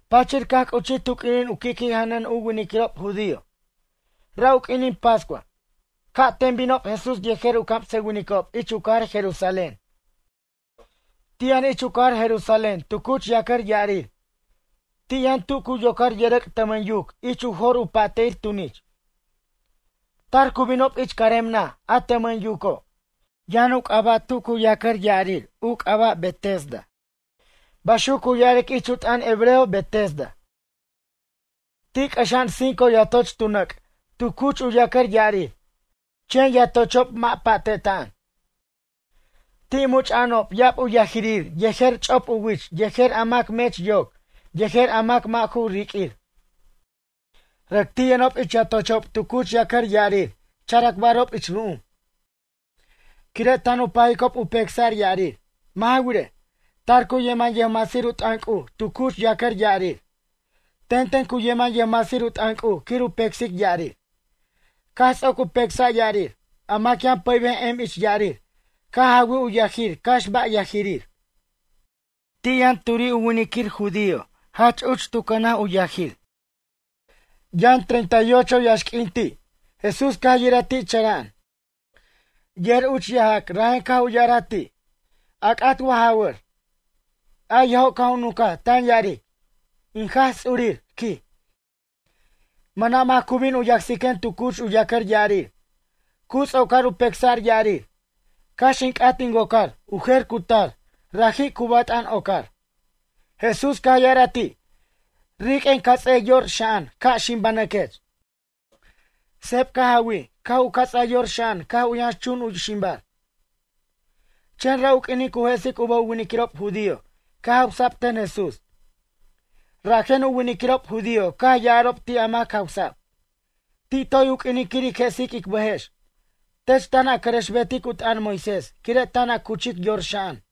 Pachir caj c'uchij tu q'uinin u qui'qui' janʌn u winiquirob judío. Ra' u q'uinin pascua, ca'ten binob Jesús yejer u camsʌwinicob ich u cajar Jerusalén. Ti' yʌn ich u cajar Jerusalén tu cuch yacʌr ya'arir. Ti' yʌn tu cu yocar yʌrʌc' tʌmʌn yuc ich u jor u pa'te'ir tunich. Tar cu binob ich carem naj a tʌmʌn yuco'. Yʌn u c'aba' tu cu yacʌr ya'arir u c'aba' Betesda. Baxuc cu ya'aric ich u t'ʌn hebreo Betesda. Ti' c'ʌxa'an cinco yatoch tu nʌc' tu cuch u yacʌr ya'arir. Chen yatochob mʌ' pa'te'ta'an. Ti' much'a'anob ya'ab u yajirir yejer ch'op u wich yejer a mac mech yoc yejer a mac a mʌ' ju riq'uir. Rʌc ti' yʌnob ich yatochob tu cuch yacʌr ya'arir characbarob ich ru'um. Quire' tan u pajicob u pecsa'r ya'arir. Mʌ' ja wirej, tar cu yeman yʌjmasir u t'ʌn C'uj tu cuch yacʌr ya'arir. Tenten cu yeman yʌjmasir u t'ʌn C'uj quir u pecsic ya'arir. Caj ts'oc u pecsa' ya'arir, a mac yʌn pʌybej em ich ya'arir caj jawij u yajir cax ba' yajirir. Ti' yʌn turi' u winiquir judío jach uch tu cʌnaj u yajir. Yʌn treinta y ocho yaxq'uin ti'. Jesús caj u yiraj ti' chara'an. Yer uch yajac rajen caj u ya'araj ti': ―A c'at wa ja jawʌr? A yajo' caj u nunca tan ya'aric: ―In Jaj Ts'urir ―quij―, mʌna' mac cu bin u yacsiquen tu cuch u yacʌr ya'arir, cu ts'ocar u pecsa'r ya'arir. Cax in c'at in wocar, u jer cu tar, raji' cu bat'an ocar. Jesús caj ya'araj ti': ―Riq'uen cats'e yor xa'an ca' ximbanʌquech. Seb caj jawij caj u cats'a yor xa'an caj u yʌnxchun u ximbar. Chen ra' u q'uinin cu jesic u bʌj u winiquirob judío caj jawsa'b ten Jesús. Rajen u winiquirob judío caj ya'arob ti' a mac jawsa'b: ―Ti' toy u q'uinin quir ic jesic ic bʌjex, tech tan a cʌrʌxbetic u t'ʌn Moisés quire' tan a cuchic yor xa'an.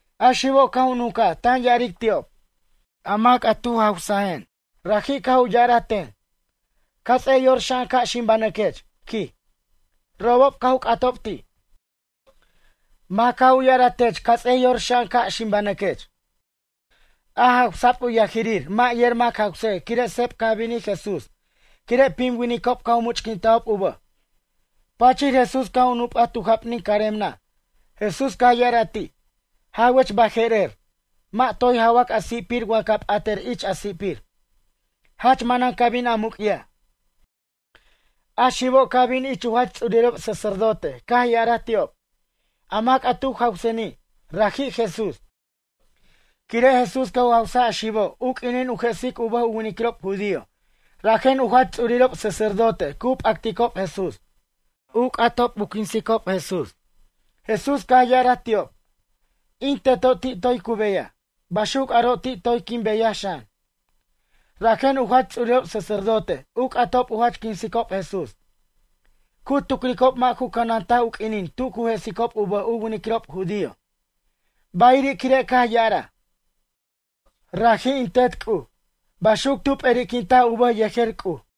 A xibo' caj u nuncaj tan ya'aric ti'ob: ―A mac a tu jawsajen. Raji' caj u ya'araj ten: “Cats'ej yor xa'an ca' ximbanʌquech” ―quij. Robob caj u c'atob ti': ―Mac caj u ya'araj tech cats'ej yor xa'an ca' ximbanʌquech? A jawsa'b u yajirir mʌ' yer mac jawsej quire' seb caj binij Jesús quire' pim winicob caj u much'quintajob u bʌj. Pachir Jesús caj u nup'aj tu jap'nin carem naj. Jesús caj ya'araj ti': ―Jawech baje'rer. Mʌ' toy jawac a si'pir wa ca p'atʌr ich a si'pir, jach manan ca bin a muc'yaj. A xibo' caj bin ich u jach ts'urirob sacerdote caj ya'araj ti'ob: ―A mac a tu jawseni', raji' Jesús. Quire' Jesús caj u jawsaj a xibo' u q'uinin u jesic u bʌj u winiquirob judío rajen u jach ts'urirob sacerdote cu p'acticob Jesús. U c'atob u quinsicob Jesús. Jesús caj ya'araj ti'ob: ―In Teto' ti' toy cu beyaj. Baxuc aro' ti' toy quin beyaj xan. Rajen u jach ts'urirob sacerdote u c'atob u jach quinsicob Jesús. Cu tucricob mʌ' ju cʌnantaj u q'uinin tu cu jesicob u bʌj u winiquirob judío. Bayiri' quire' caj ya'araj: “Raji' in Tet C'uj.” Baxuc tu p'eri'quintaj u bʌj yejer C'uj.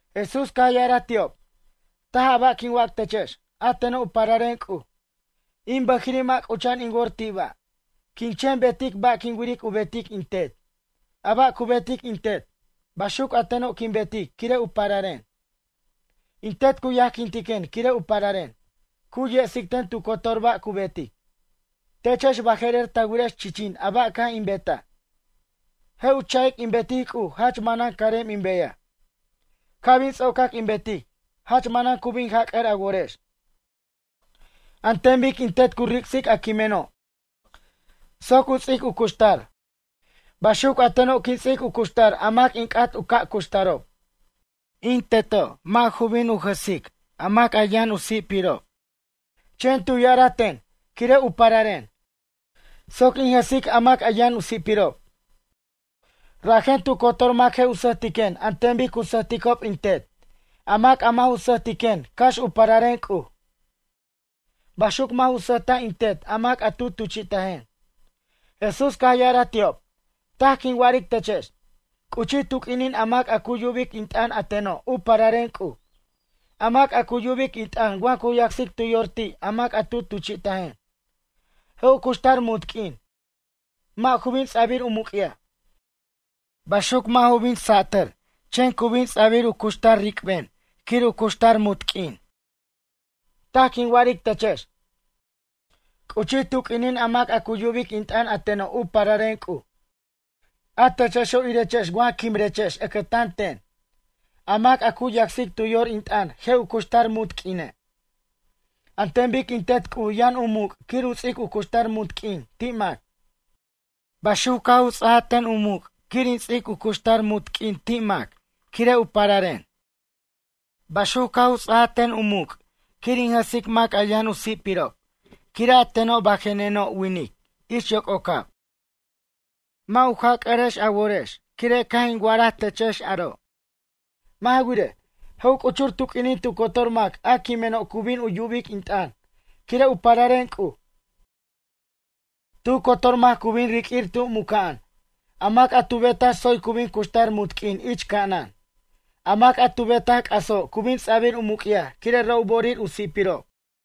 Jesús caj ya'araj ti'ob: ―Taj a ba' quin wac techex, a teno' u pararen C'uj. In bʌjiri' mʌ' c'ucha'an in wor ti' ba'. Quin chen betic a ba' quin wiric u betic in Tet. A ba' cu betic in Tet, baxuc a teno' quin betic quire' u pararen. In Tet cu yajquintiquen quire' u pararen. Cu yesic ten tu cotor ba' cu betic. Techex baje'rer ta wirex chichin a ba' caj in betaj. Je' u cha'ic in betic C'uj jach manan carem in beyaj. Ca' bin ts'ocac in betic, jach manan cu bin jac'ʌr a worex. An ten bic in Tet cu ric'sic a quimeno' soc u ts'ic u cuxtar. Baxuc a teno' quin ts'ic u ca' cuxtar a mac in c'at u ca' cuxtarob. In Teto' mʌ' ju bin u jʌsic a mac yʌn u si'pirob. Chen tu ya'araj ten, quire' u pararen, soc in jʌsic a mac yʌn u si'pirob. Rajen tu cotor mac je' u sʌjtiquen an ten bic cu sʌjticob in Tet. A mac a mʌ' ju sʌjtiquen cax u pararen C'uj, baxuc mʌ' ju sʌjta' in Tet a mac a tu tuchi'tajen. Jesús caj ya'araj ti'ob: ―Taj quin wa'aric techex: C'uchij tu q'uinin a mac a cu yubic in t'ʌn a teno' u pararen C'uj, a mac a cu yubic in t'ʌn wa cu yacsic tu yor ti' a mac a tu tuchi'tajen, je' u cuxtar munt q'uin. Mʌ' ju bin ts'abir u muc'yaj. Baxuc mʌ' ju bin satʌr chen cu bin ts'abir u cuxtar ric'ben quir u cuxtar munt q'uin. Taj quin wa'aric techex. C'uchij tu q'uinin a mac a cu yubic in t'ʌn a teno' u pararen C'uj. A techexo' irechex wa quimrechex ʌcʌtan ten. A mac a cu yacsic tu yor in t'ʌn je' u cuxtar munt q'uine'. An ten bic in Tet C'uj yʌn u muc' quir u ts'ic u cuxtar munt q'uin ti' mac. Baxuc caj u ts'aj ten u muc' quir in ts'ic u cuxtar munt q'uin ti' mac, quire' u pararen. Baxuc caj u ts'aj ten u muc' quir in jʌsic mac a yʌn u si'pirob quire' a teno' bajeneno' winic ich yoc'ocab. Mʌ' u jac'ʌrex a worex quire' caj in wa'araj techex aro'. Mʌ' ja wirej, je' u c'uchur tu q'uinin tu cotor mac a quimeno' cu bin u yubic in t'ʌn quire' u pararen C'uj. Tu cotor mac cu bin riq'uir tu mucnaj. A mac a tu betaj tsoy cu bin cuxtar munt q'uin ich ca'anan. A mac a tu betaj c'aso' cu bin ts'abir u muc'yaj quire' ra' u bo'orir u si'pirob.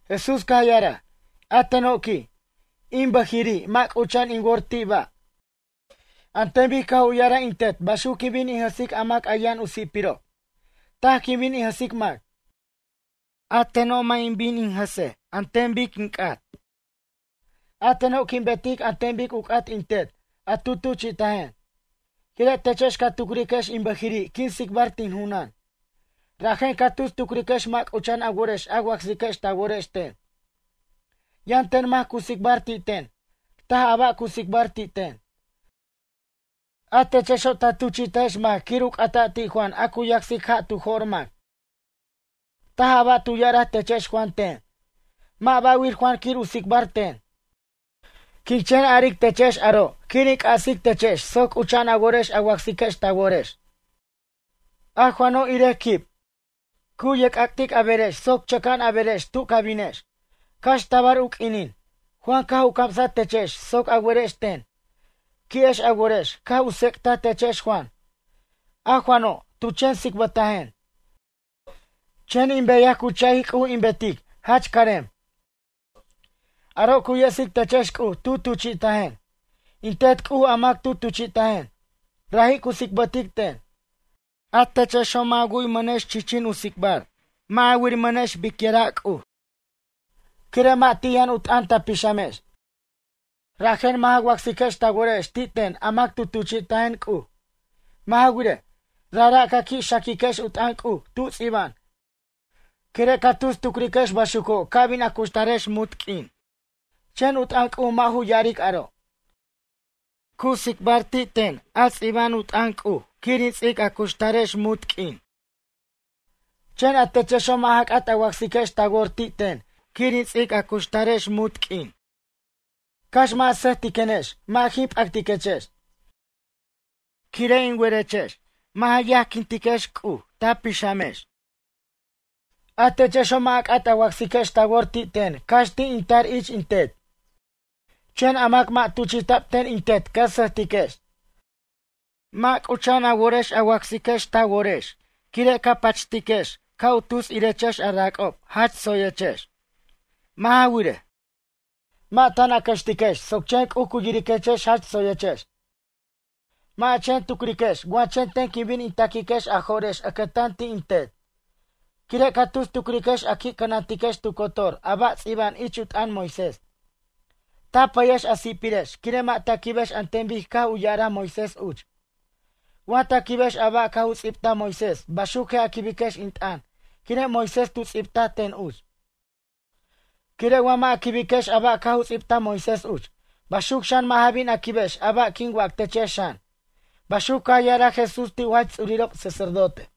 Jesús caj ya'araj: ―A teno' ―quij―, in bʌjiri' mʌ' c'ucha'an in wor ti' ba'. An ten bic caj u ya'araj in Tet baxuc quin bin in jʌsic a mac a yʌn u si'pirob. Taj quin bin in jʌsic mac. A teno' mʌ' in bin in jʌsej an ten bic in c'at. A teno' quin betic an ten bic u c'at in Tet a tu tuchi'tajen. Quire' techex ca tucriquex in bʌjiri' quin tsicbar tin junan. Rajen ca tus tucriquex mʌ' c'ucha'an a worex a wacsiquex ta worex ten. Yʌn ten mac cu tsicbar ti' ten. Taj a ba' cu tsicbar ti' ten. A techexo' ta tuchi'tajex mac quir u c'ata' ti' Juan a cu yacsic ja' caj u jo'r mac. Taj a ba' tu ya'araj techex Juan ten. Mʌ' ba'wir Juan quir u tsicbar ten. Quin chen aric techex aro' quir in c'asictechex soc c'ucha'an a worex a wacsiquex ta worex. A Juano' irej quib, cu ye'c'ac'tic a berex soc chʌca'an a berex tu ca binex. Cax tabar u q'uinin, Juan caj u camsaj techex soc a werex ten. Qui'ex a worex caj u tsec'taj techex Juan. A Juano', tu chen tsicbʌtajen. Chen in beyaj cu cha'ic C'uj in betic jach carem. Aro' cu yesic techex C'uj tu tuchi'tajen. In Tet C'uj a mac tu tuchi'tajen, raji' cu tsicbʌtic ten. A techexo' mʌ' ja wu'yʌmʌnex chichin u tsicbar, mʌ' ja wiramʌnex bicyʌra' C'uj. Quire' mʌ' ti' yʌn u t'ʌn ta pixamex. Rajen mʌ' ja wacsiquex ta worex ti' ten a mac tu tuchi'tajen C'uj. Mʌ' ja wirej, rajra' ca qui' xaquiquex u t'ʌn C'uj tu ts'iba'an quire' ca tus tucriquex baxuco' ca bin a cuxtarex munt q'uin. Chen u t'ʌn C'uj mʌ' ju ya'aric aro'. Cu tsicbar ti' ten a ts'iba'an u t'ʌn C'uj quir in ts'ic a cuxtarex munt q'uin. Chen a techexo' mʌ' ja c'at a wacsiquex ta wor ti' ten quir in ts'ic a cuxtarex munt q'uin. ’Cax mʌ' a sʌjtiquenex mʌ' jin pʌq'uiquechex. Quire' in werechex, mʌ' ja yajquintiquex C'uj ta pixamex. A techexo' mʌ' a c'at a wacsiquex ta wor ti' ten cax ti' in tar ich in Tet. Chen a mac mʌ' tuchi'ta'b ten in Tet ca sʌjtiquex. Mʌ' c'ucha'an a worex a wacsiquex ta worex quire' ca pachtiquex ca' u tus yirechex a rac'ob jach tsoyechex. Mʌ' ja wirej, mʌ' tan a cʌxtiquex soc chen C'uj cu yiriquechex jach tsoyechex. Mʌ' a chen tucriquex wa chen ten quin bin in ta'quiquex a jo'rex ʌcʌtan ti' in Tet. Quire' ca tus tucriquex a qui' cʌnantiquex tu cotor a ba' ts'ibta'b ich u t'ʌn Moisés. Ta pʌyex a si'pirex quire' mʌ' ta quibex an ten bic caj u ya'araj Moisés uch. Wa ta quibex a ba' caj u ts'ibtaj Moisés baxuc je' a quibiquex in t'ʌn quire' Moisés tu ts'ibtaj ten uch. Quire' wa mʌ' a quibiquex a ba' caj u ts'ibtaj Moisés uch, baxuc xan mʌ' ja bin a quibex a ba' quin wac techex xan ―baxuc caj ya'araj Jesús ti' u jach ts'urirob sacerdote.